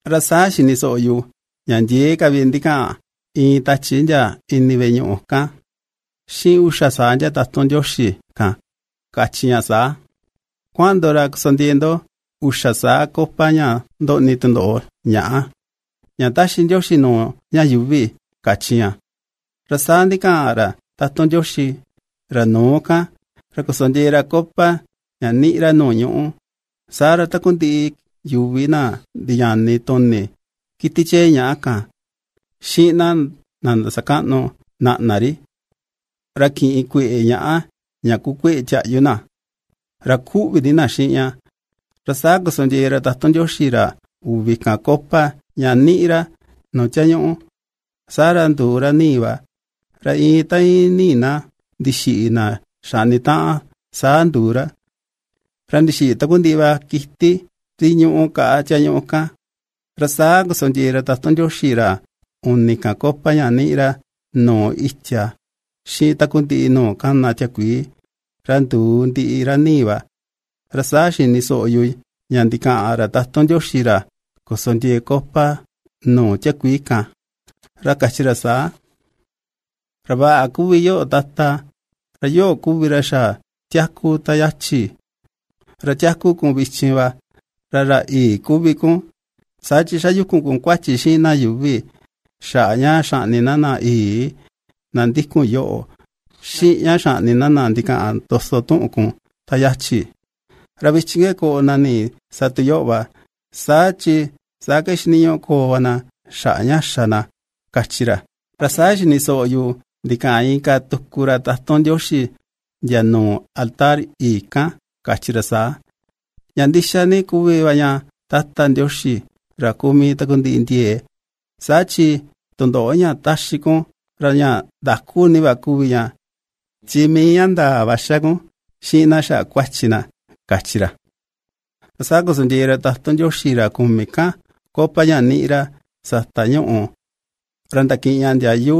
Ra saa xini soꞌo yu ña ndiee ka vi ndikaꞌan iin tachi ndia ini veꞌe ñuꞌu kan, xiꞌin uxa saa ndia tatun Ndioxi kan, kachi ña saa: ―Kuaꞌan ndo ra kosondiee ndo uxa saa copa ña ndoꞌni tundoꞌo ñàꞌa, ña ^taxi Ndioxi nuu ña yuuvi ―kachi ña. Ra saa ndixaꞌan ra tatun Ndioxi, ra nuu kan, ra kosondiee ra copa ña ^niꞌi ra nuu ñuꞌú, saa ra takundiꞌi yuvi na ndiñani tuni kiti chee ñàꞌa kan, xiꞌin na ndasakaꞌnu naꞌna ri, ra kiꞌin kueꞌe ñàꞌa na, ña kuu kueꞌe tiaꞌyu, ra ^kuꞌvi ni na xiꞌin ña. Ra saa kosondiee ra tatun Ndioxi, ra uvi kan, copa ña ^niꞌi ra, nuu tiañuꞌu. Saa ra nduu ra ni̱i̱ va, ra iin ta íin ni̱i̱ na ndixiꞌi na xaꞌni taꞌan saa nduu ra, ra ndixiꞌi takundiꞌi va kiti ri ñúꞌu kaꞌa tiañuꞌu kan. Ra saa kosondiee ra tatun Ndioxi, ra uni kan, copa ña ^niꞌi ra, nuu itia, xiꞌin takundiꞌi nuu kana tiakuii, ra nduu ndiꞌi ra ni̱i̱ va. Ra saa xini soꞌo yu ña ndikaꞌan ra tatun Ndioxi ra kosondiee copa nuu tiakuii kan, ra kachi ra saa: ―Ra vaꞌa kuvi yoꞌo Tata, ra yoꞌo kuvi ra xa tiaku ta yachi, ra tiaku kun vichin va, ra ra yii kuvi kun, saa chi xayukun kun kuachi xiꞌin na yuuvi xaꞌa ña xaꞌni na na yii, na ^ndikun yoꞌo, xiꞌin ña xaꞌni na, na ndikaꞌan ndoso tuꞌun kun te yachi, ra vichin ke koꞌo na nii sa tu yoꞌo va, chi saa ke xiniñuꞌu koo va na xaꞌa ña xa na ―kachi ra. Ra saa xini soꞌo yu ndikaꞌan inka tuku ra tatun Ndioxi, ndia nuu altar yii kan kachi ra saa: ―Ña ndixa ni kuvi va ña, Tata Ndioxi, ra kuu mii takundiꞌi ndiee, saa chi tundoꞌo ña ^taxi kun ra ña ndaku ni va kuvi ña, chi mii ña ndaa va ^xa kun xiꞌin na xaꞌa kuachi na ―kachi ra. Ra saa kosondiee ra tatun Ndioxi, ra kumi kan, copa ña ^niꞌi ra sata ñuꞌù, ra ndakiꞌin ña ndiayu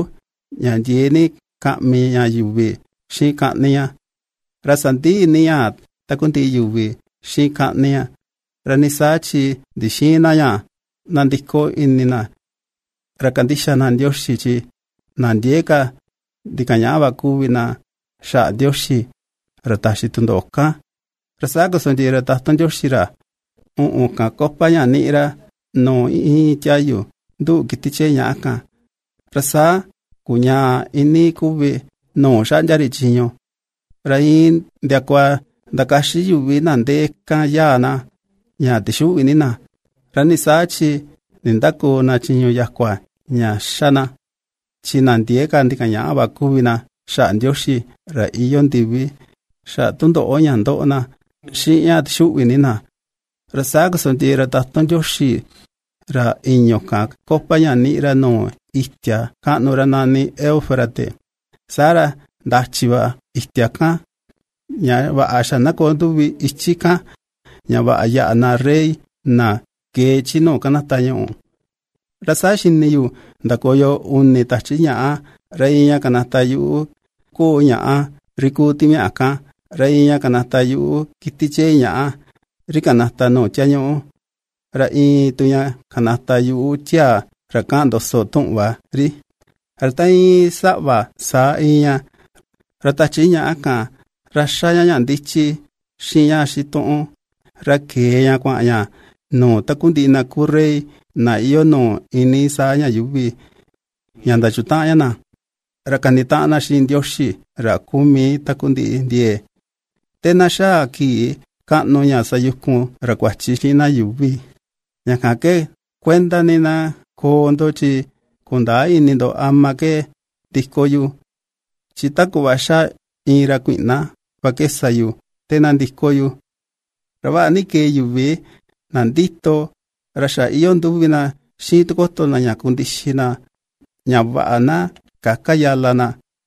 ña ndiee ni kaꞌmi ña yuvi xiꞌin kaꞌni ña. Ra sandi̱i ni ña takundiꞌi yuvi xiꞌin kaꞌni ña; ra ni saa chi ndixïin na ña nandiko ini na, ra kandixa na Ndioxi, chi na ndiee ka ndikañaꞌa va kuvi na xaꞌa Ndioxi, ra taxi tundoꞌo kan. Ra saa kosondiee ra tatun Ndioxi, ra uꞌun kan, copa ña ^niꞌi ra nuu iin tiayu nduꞌu kiti chee ñaꞌa kan, ra saa kuñaa iinii kuvi nuu xaꞌndia ri chiñu. Ra iin ndiakua ndakaxi yuvi na ndee kan yaa na, ña tixuꞌvi ní na. Ra nii saa chi nindäkoo na chiñu yakua ña ^xa na, chi na ndiee ka ndikañaꞌa va kuvi na xaꞌa Ndioxi ra iyoo ndivi, xaꞌa tundoꞌo ña ^ndoꞌo na, xiꞌin ña ^tixuꞌvi ni na. Ra saa kosondiee ra tatun Ndioxi, ra i̱ñu̱ kan, copa ña ^niꞌi ra nuu itia kaꞌnu ra nani Eufrates, saa ra ndachi va itia kan, ña vaꞌa xa na koo nduvi ichi kan, ña vaꞌa yáꞌa na rey na kee chi nuu ^kanata ñuꞌu. Ra saa xini yu ndakoyo uni tachi ñàꞌa, ra iin ña kanata yuꞌu ko̱o̱ ñàꞌa ri ku timiaꞌa kan, ra iin ña kanata yuꞌu kiti chee ñàꞌa ri kanata nuu tiañuꞌu, ra iin tu ña kanata yuꞌu tiaa ra ^kaꞌan ndoso tuꞌun va ri, ra ta íin saꞌva saa íin ña; ra tachi ñàꞌa kan, ra ^xa ña ña ndichi, xiꞌin ña xituꞌun, ra kee ña kuaꞌan ña nuu takundiꞌi na kuu rey na iyoo nuu iinii saa ña yuuvi, ña ndachutaꞌan ña na, ra kanitaꞌan na xiꞌin Ndioxi ra kuu mii takundiꞌi ndiee, te na xaa kii kaꞌnu ña sayukun ra kuachi xiꞌin na yuuvi. Ña kan ke kuenda ni na koo ndo, chi kundäa ini ndo ama ke ndiko yu, chi ta kuꞌva ^xa iin ra kuiꞌna va ke sa yu te na ndiko yu. Ra vaꞌa ni kee yuvi na ndito, ra xa iyoo nduvi na xiꞌin tikoto ña kundixi na ña vaꞌa na käka yala na,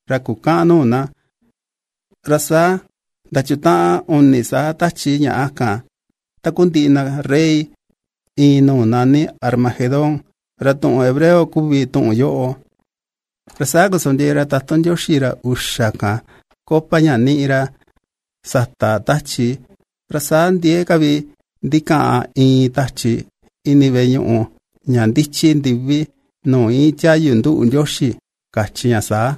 ra kukäꞌan nuu na. Ra saa ndachutaꞌan uni saa tachi ñàꞌa kan takundiꞌi na rey, iin nuu nani Armagedón, ra tuꞌun hebreo kuvi tuꞌun yoꞌo. Ra saa kosondiee ra tatun Ndioxi, ra uxa kan, copa ña ^niꞌi ra sata tachi, ra saa ndiee ka vi ndikaꞌan iin tachi ini veꞌe ñuꞌu ña ndichi ndivi, nuu íin tiayu nduꞌu Ndioxi, kachi ña saa: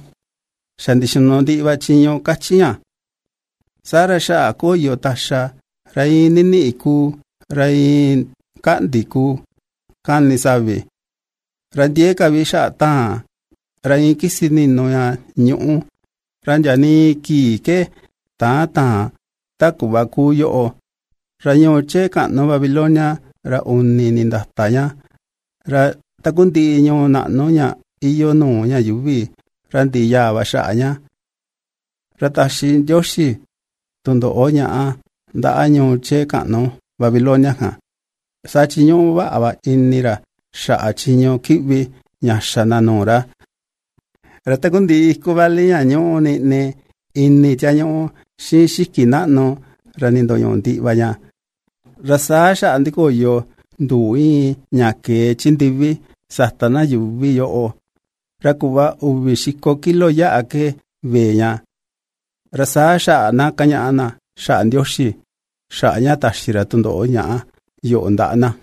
―Xa ndixinu ndiꞌi va chiñu ―kachi ña. Saa ra xaꞌa koyo taxa, ra iin niniꞌi kuu, ra iin kaꞌndi kuu kani savi, ra ndiee ka vi xaꞌa taan, ra iin kisi ninu ña ñuꞌú, ra ndia nii kii ke täꞌan táa̱n ta kuꞌva ^kuu yoꞌo. Ra ñuu chee kaꞌnu Babilonia ra uni nindata ña, ra takundiꞌi ñuu naꞌnu ña iyoo nuu ña yuuvi, ra ndiꞌi yaa va xaꞌa ña. Ra taxi Ndioxi tundoꞌo ñaꞌa ndaꞌa ñuu chee kaꞌnu Babilonia kan, saa chi ñúꞌu va ini ra xaꞌa chiñu kiꞌvi ña xa na nuu ra. Ra takundiꞌi iku vali ña ñúꞌu niꞌni ini tiañuꞌu, xiꞌin xiki naꞌnu ra nindoñuꞌu ndiꞌi va ña. Ra saa xaꞌa ndikoyo nduu ñíꞌi ña kee chi ndivi sata na yuuvi yoꞌo, ra kuꞌva uvi xiko kilo yáꞌa ke vee ña, ra saa xaꞌa na kañaꞌa na xaꞌa Ndioxi, xaꞌa ña ^taxi ra tundoꞌo ñaꞌa yoꞌo ndaꞌa na.